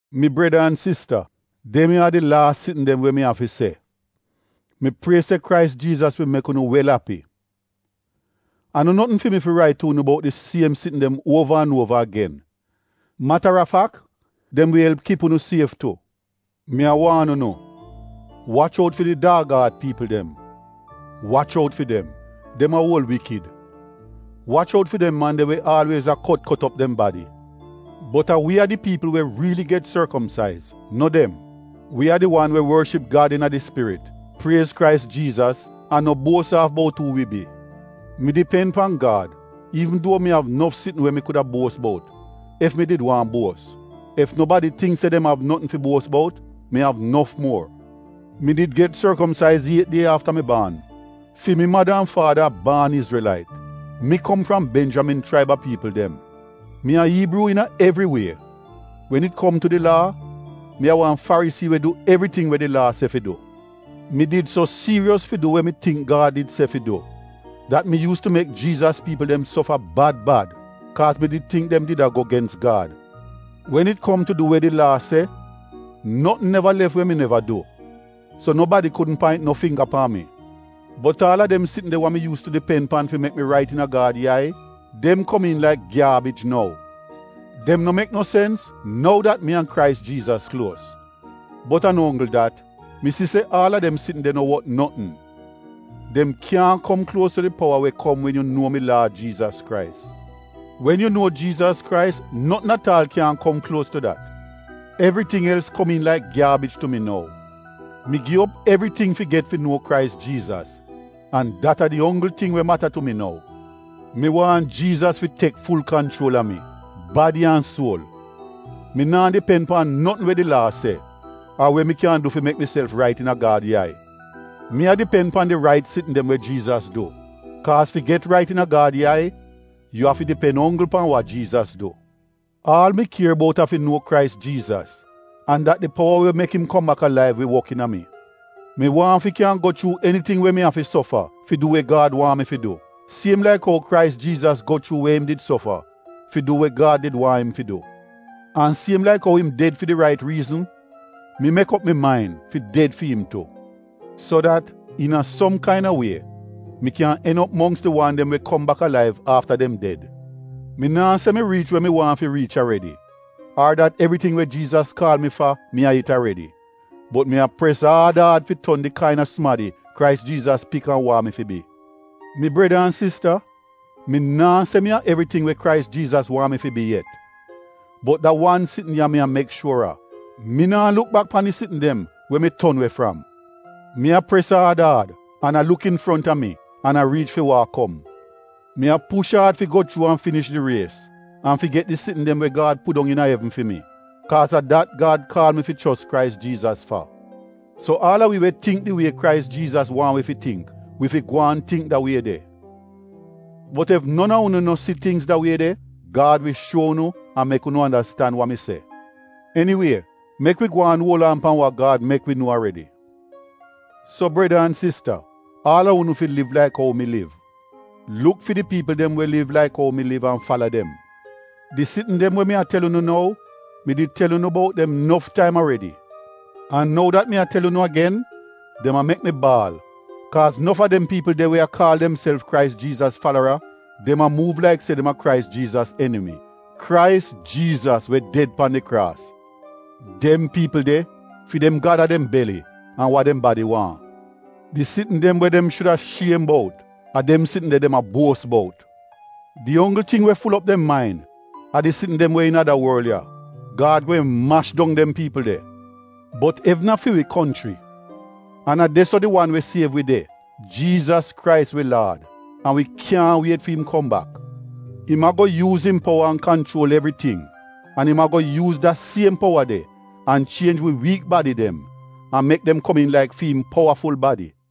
Mi breda an sista, dem ya a di laas sitn dem we mi av fi se. Mi prie se Krais Jiizas wi mek unu wel api. A no notn fi mi rait tu unu bout di siem sitn dem uova an uova agen. Matarafak, dem wi elp kip unu sief tu. Mi a waan unu, wach out fi di daag aat piipl dem. Wach out fi dem — dem a uol wikid. Wach out fi dem man de we aalwiez a kot kot op dem badi. Bot a wi a di piipl we riili get sorkomsaiz — no dem. Wi a di wan we worship Gad iina di Spirit, priez Krais Jiizas, an no buos aaf bout uu wi bi. Mi dipen pan Gad iivn duo mi av nof sitn we mi kuda buos bout ef mi did waahn buos. Ef nobadi tingk se dem av notn fi buos bout, mi av nof muor. Mi did get sorkomsaiz iet die afta mi baan. Fi mi mada an faada a baan Izrelait. Mi kom fram Benjamin chraib a piipl dem. Mi a Iibruu iina evri wie. Wen it kom tu di Laa, mi a wan Farisii we du evriting we di Laa se fi du. Mi did so siiros fi du we mi tingk Gad di se fi du dat mi yuus tu mek Jiizas piipl dem sofa bad bad, kaaz mi did tingk dem did a go gens Gad. Wen it kom tu du we di Laa se, notn neva lef we mi neva du. So nobadi kudn paint no fingga pan mi. Bot aal a dem sitn de wa mi yuus tu dipen pan fi mek mi rait iina Gad yai, dem komiin laik gyaabij nou. Dem no mek no sens nou dat mi an Krais Jiizas kluos. Bot a no onggl dat, mi si se aal a dem sitn de no wot notn. Dem kyaahn kom kluos tu di powa we kom wen yu nuo mi Laad Jiizas Krais. Wen yu nuo Jiizas Krais, notn at aal kyaahn kom kluos tu dat. Evriting els komiin laik gyaabij tu mi nou. Mi gi op evriting fi get fi nuo Krais Jiizas an dat a di onggl ting we mata tu mi nou. Mi waahn Jiizas fi tek ful kanchuol a mi — badi an suol. Mi naa dipen pan notn we di Laa se, ar we mi kyan du fi mek miself rait iina Gad yai. Mi a dipen pan di rait sitn dem we Jiizas du, kaaz fi get rait iina Gad yai yu afi dipen onggl pan wa Jiizas du. Aal mi kier bout a fi nuo Krais Jiizas, an dat di powa we mek im kom bak alaiv wi wok iina mi. Mi waahn fi kyan go chuu eniting we mi afi sofa fi du we Gad waahn mi fi du, siem laik ou Krais Jiizas go chuu we im did sofa fi du we Gad did waahn im fi du. An siem laik ou im ded fi di rait riizn, mi mek op mi main fi ded fi im tu, so dat, iina som kain-a wie, mi kyan en op mongks di wan dem we kom bak alaiv afta dem ded. Mi naa se mi riich we mi waahn fi riich aredi, ar dat evriting we Jiizas kaal mi fa mi a it aredi. Bot mi a pres aad aad fi ton di kain-a sumadi Krais Jiizas pik an waahn mi fi bi. Mi breda an sista, mi naa se mi a evriting we Krais Jiizas waahn mi fi bi yet. Bot da wan sitn ya mi a mek shuor a, mi naa luk bak pan di sitn dem we mi ton we fram. Mi a pres aad aad an a luk infronta mi an a riich fi wa a kom. Mi a push aad fi go chuu an finish di ries an fi get di sitn dem we Gad pudong iina evn fi mi, kaaz a dat Gad kaal mi fi chos Krais Jiizas fa. So aal a wi we tingk di wie Krais Jiizas waahn wi fi tingk, wi fi gwaan tingk da wie de. Bot ef non a unu no si tingz da wie de, Gad wi shuo unu an mek unu andastan wa mi se. Eniwie, mek wi gwaan uol aan pan wa Gad mek wi nuo aredi. So breda an sista, aal a unu fi liv laik ou mi liv. Luk fi di piipl dem we liv laik ou mi liv an fala dem. Di sitn dem we mi a tel unu nou mi did tel unu bout dem nof taim aredi. An nou dat mi a tel unu agen, dem a mek mi baal kaaz nof a dem piipl de we a kaal demself Krais Jiizas falara, dem a muuv laik se dem a Krais Jiizas enimi — Krais Jiizas we ded pan di kraas. Dem piipl de, fi dem gad a dem beli an wa dem badi waahn. Di sitn dem we dem shuda shiem bout, a dem sitn de dem a buos bout. Di onggl ting we ful op dem main a di sitn dem we iina da worl ya. Gad gweehn mash dong dem piipl de. Bot evn a fi wi konchri. An a de-so di wan we siev wi de, Jiizas Krais wi Laad, an wi kyaahn wiet fi im kom bak! Im a-go yuuz im powa an kanchuol evriting. An im a-go yuuz da siem powa de an chienj wi wiik badi dem, an mek dem komiin laik fi im powaful badi.